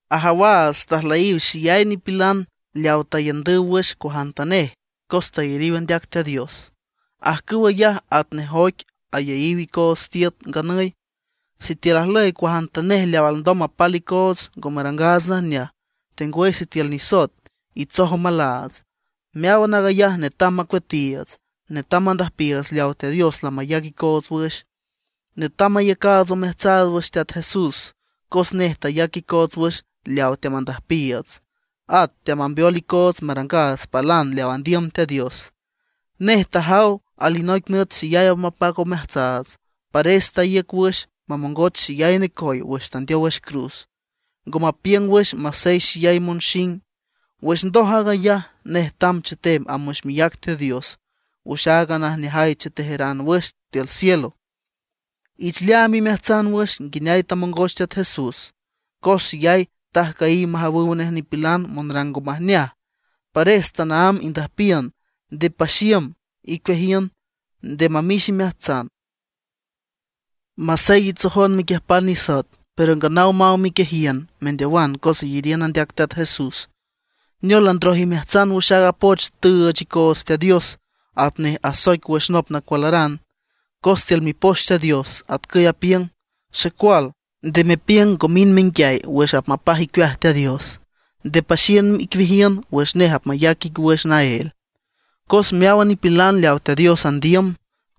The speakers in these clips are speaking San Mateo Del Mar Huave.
Ajawaats tajlüyiw xeyay nipilan leaw taiündüw wüx cuajantanej cos tayariw andeac Teat Dios; ajcüw ayaj atnej oic ayeyiw icoots tiüt nganüy. Sitiül ajlüy cuajantanej leaw alndom mapal icoots ngo marangaats najneaj, tengwüy sitiül nisoet itsoj omalaats, meáwan aag ayaj netam macueatiiüts. Netam mandüjpiiüts leaw Teat Dios lamayac icoots wüx. Netam mayacaats omeajtsaats wüx Teat Jesús, cos nej tayac icoots wüx leaw teamandüjpiiüts, at teamambeol icoots marangaats palan leaw andiüm Teat Dios. Nej tajaw alinoic nüt xeyay apmapac omeaats, pares taíüc wüx mamongoch xeyay necoy wüx tandeow wüx cruz, ngo mapiüng wüx masey xeyay monxing. Wüx ndoj aag ayaj, nej tamb chetem amb wüx miác Teat Dios wüx aaga najneaj chetejeran wüx tiül cielo. Ich leaam imeajtsan wüx nguineay tamongoch Teat Jesús; cos xeyay tajcüyiw majawüw nej nipilan monrang ngo majneaj. Pares tanaámb indüjpiün, nde paxiüm icueajiün, nde mamix imeajtsan. Masey itsojon mequiüjpan nisoet, pero nganaw maw miquiejiün mendeowan cos iyariün andeac Teat Jesús. ¡Neol landroj imeajtsan wüx aaga poch tüüch icon Teat Dios atnej asoic wüx nop nacualaran! Cos tiül Mipoch Teat Dios atcüy apiüng: Xecual, nde mepiüng ngo mind menguiay wüx apmapaj icueaj Teat Dios. Nde paxiüm icueajiün wüx nej apmayac ic wüx naél. Cos meáwan nipilan leawa Teat Dios andiüm,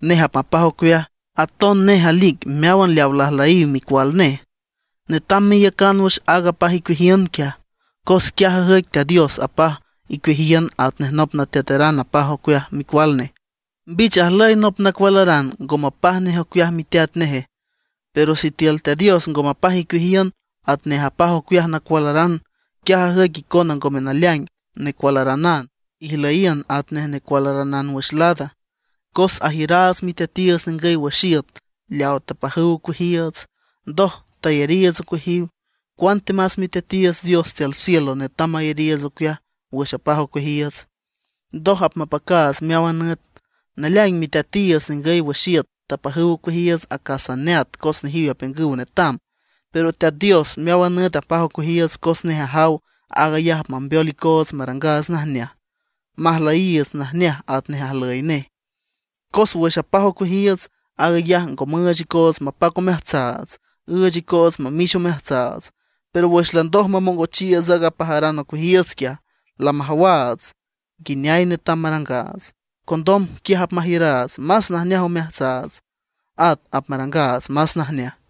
nej apmapaj ocueaj. Aton nej alic meáwan leawa lajlüyiw micual nej. Netam meiücan wüx aaga apaj icueajiün quiaj; cos quiaj ajüic Teat Dios apaj icueajiün atnej nop nateateran apaj ocueaj micual nej. ¿Mbich ajlüy nop nacualaran ngo mapaj nej ocueaj miteat neje? Pero sitiül Teat Dios ngo mapaj icueajiün atnej ajpaj ocueaj nacualaran, quiaj ajüic icona ngome naleaing necualaranan, ijlüyiün atanej necualaranan wüx lada. Cos ajiüraats miteatiiüts ningüy wüx iüt leaw tapajüw ocueajiiüts, ndoj tayariiüts ocueajiw. ¡Cuantemas Miteatiiüts Dios tiül cielo netam mayariiüts ocueaj wüx apaj ocueajiiüts, ndoj apmapacaats meáwan nüt! Naleaing miteatiiüts ningüy wüx iüt tapajüw ocueajiiüts acas neat cos nejiw apiüngüw netam; pero Teat Dios meáwan nüt apaj ocueajiiüts cos nej ajaw aag ayaj apmambeol icoots marangaats najneaj, majlüyiiüts najneaj atnej ajlüy nej. Cos wüx ajpaj ocueajiiüts, aag ayaj ngo müüch icoots mapac omeajtsaats; üüch icoots mamix omeajtsaats. Pero wüx landoj mamongochiiüts aaga apajaran ocueajiiüts quiaj, lamajawaats nguineay netam marangaats. Condom quiaj apmajiüraats más najneaj omeajtsaats, at apmarangaats más najneaj.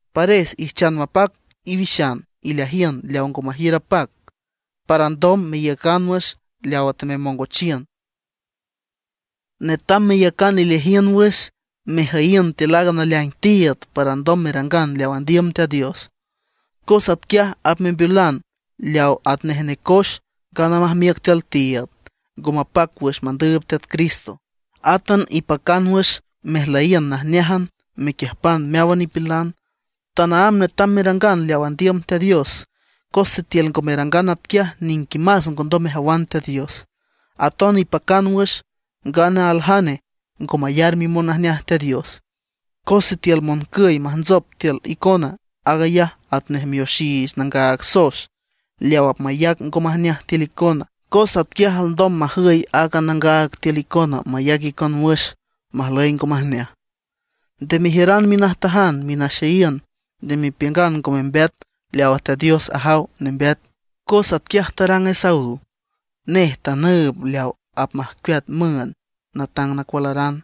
Pares ijchan mapac iwixan ileajiün leaw ngo majiür apac, para alndom meiücan wüx leawa tememongochiün. Netam meyacan ileajiün wüx mejüyiün tiül aaga naleaing tiiüd para ndom merangan leaw andiüm Teat Dios, cos atquiaj apmembeolan leaw atnej necoex ngana majmiüc tiül tiiüd, ngo mapac wüx mandüüb Teat Cristo. Átan ipacan wüx mejlüyiün najneájan mequiüjpan meáwan nipilan, tanaámb netam merangan leaw andiüm Teat Dios. Cos sitiül ngo merangan atquiaj niquimas ngondom mejawan Teat Dios. Aton ipacan wüx, ngana aljane ngo mayar mimonajneaj Teat Dios. Cos sitiül moncüy majntsop tiül icona, aag ayaj atnej mioxiich nangaag soex leaw apmayac ngo majneaj tiül icona. Cos atquiaj alndom majüy aaga nangaag tiül icona mayac icon wüx majlüy ngo majneaj. Nde mejiüran minajtajan, minaxeyiün; nde mepiüngan ngo membeat leawa Teat Dios ajaw nembeat, cos atquiaj tarang Esaú. Nej tanüüb leaw apmajcueat müünd natang nacualaran.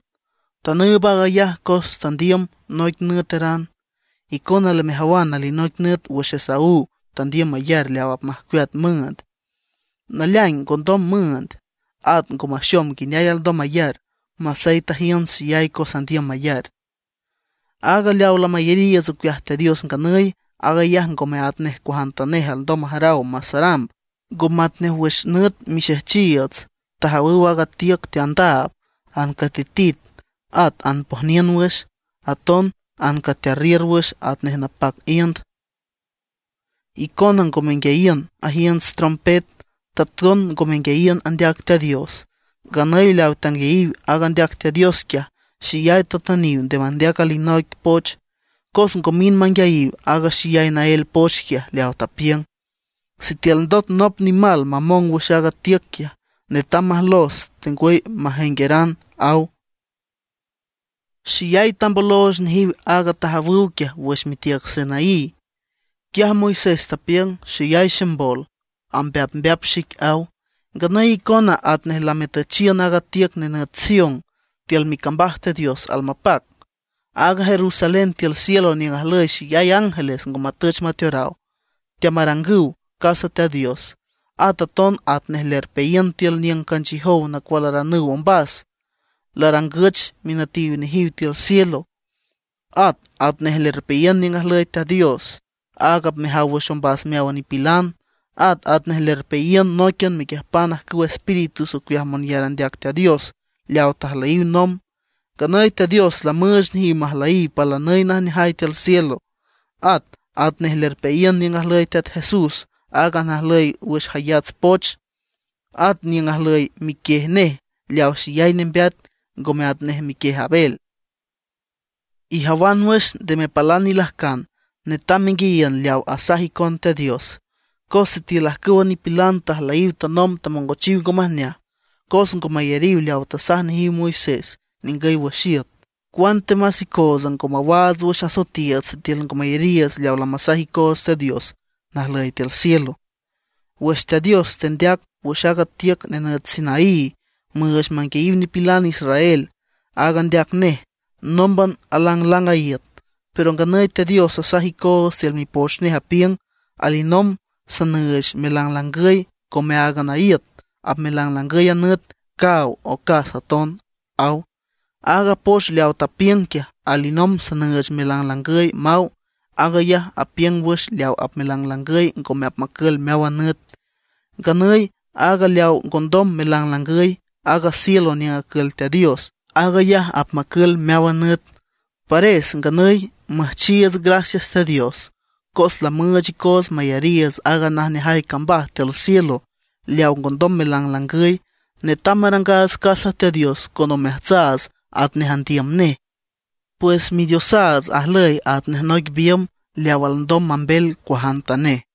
Tanüüb aag ayaj cos tandiüm noic nüeteran. Icona lamejawan alinoic nüt wüx Esaú tandiüm mayar leaw apmajcueat müünd, naleaing ngondom müünd, at ngo maxom nguineay alndom mayar, masey tajiünts xeyay cos andiüm mayar. Aaga leawa lamayariiüts ocueaj Teat Dios nganüy, aag ayaj ngome atnej cuajantanej alndom majaraw masaramb. Ngo matnej wüx nüt mixejchiiüts tajawüw aaga tiüc teandaab, ancatitit, at anpojniün wüx, aton ancatearriür wüx atnej napac iünd. Icona ngo menguiayiün ajiünts trompet, taton ngo menguiayiün andeac Teat Dios. Nganüy leaw tanguiayiw aaga andeac Teat Dios quiaj, xeyay tatüniw nde mandeac alinoic poch. Cos ngo mind manguiayiw aaga xeyay naél poch quiaj leaw tapiüng: “Sitiül ndot nop nimal mamong wüx aaga tiüc quiaj, netam majlos tengwüy majengueran”, aw. Xeyay tambolooch nejiw aaga tajawüw quiaj wüx mitiüc Sinaí. Quiaj Moisés tapiüng: “Xeyay ximbol, ambeapmbeap xic”, aw. Nganüy icona atnej lametüchiün aaga tiüc nenüt Sión, tiül micambaj Teat Dios almapac, aaga Jerusalén tiül cielo niüng ajlüy xeyay ángeles ngo matüch mateoraw; teamarangüw casa Teat Dios. At aton atnej lerpeayiün tiül niüng canchiüjow nacualaranüw ombas, larangüch minütiw nejiw tiül cielo. At atnej lerpeayiün niüng ajlüy Teat Dios, áag apmejaw wüx ombas meáwan nipilan. At atnej lerpeayiün nóiquian mequiüjpan ajcüw espíritus ocueaj monyar andeac Teat Dios leaw tajlüyiw nomb. Nganüy Teat Dios lamüüch nejiw majlüyiw palanüy najneajay tiül cielo. At atnej lerpeayiün niüng ajlüy Teat Jesús, aaga najlüy wüx jayats poch. At niüng ajlüy miquiej nej leaw xeyay nembeat, ngome atnej miquiej Abel. Ijawan wüx, nde mepalan ilajcan, netam menguiayiün leaw asaj icon Teat Dios. Cos sitiül ajcüwa nipilan tajlüyiw tanomb tamongochiw ngo majneaj, cos ngo mayariw leaw tasaj nejiw Moisés ningüy wüx iüt; ¡cuantemas icootsa ngo mawaats wüx asoetiiüts sitiül ngo mayariiüts leaw lamasaj icoots Teat Dios najlüy tiül cielo! Wüx Teat Dios tendeac wüx aaga tiüc nenüt Sinaí müüch manguiayiw nipilan israel, áag andeac nej nómban alanglang a iüt. Pero nganüy Teat Dios asaj icoots tiül Mipoch nej, apiüng: “Alinomb sanüüch melanglangüy ngome áagan a iüt; apmelanglangüy a nüt, caaw, ocas aton”, aw. Aaga poch leaw tapiüng quiaj: “Alinomb sanüüch melanglangüy” maw, aag ayaj apiüng wüx leaw apmelanglangüy ngome apmacül meáwan nüt. Nganüy aaga leaw ngondom melanglangüy, aaga cielo niüng acül Teat Dios, aag ayaj apmacül meáwan nüt. Pares nganüy müjchiiüts gracias Teat Dios, cos lamüüch icoots mayariiüts aaga najneajay cambaj tiül cielo leaw ngondom melanglangüy. Netam marangaats casa Teat Dios con omeajtsaats atnej andiüm nej. Pues Midiosaats ajlüy atnej noic biümb leaw alndom mambel cuajantanej.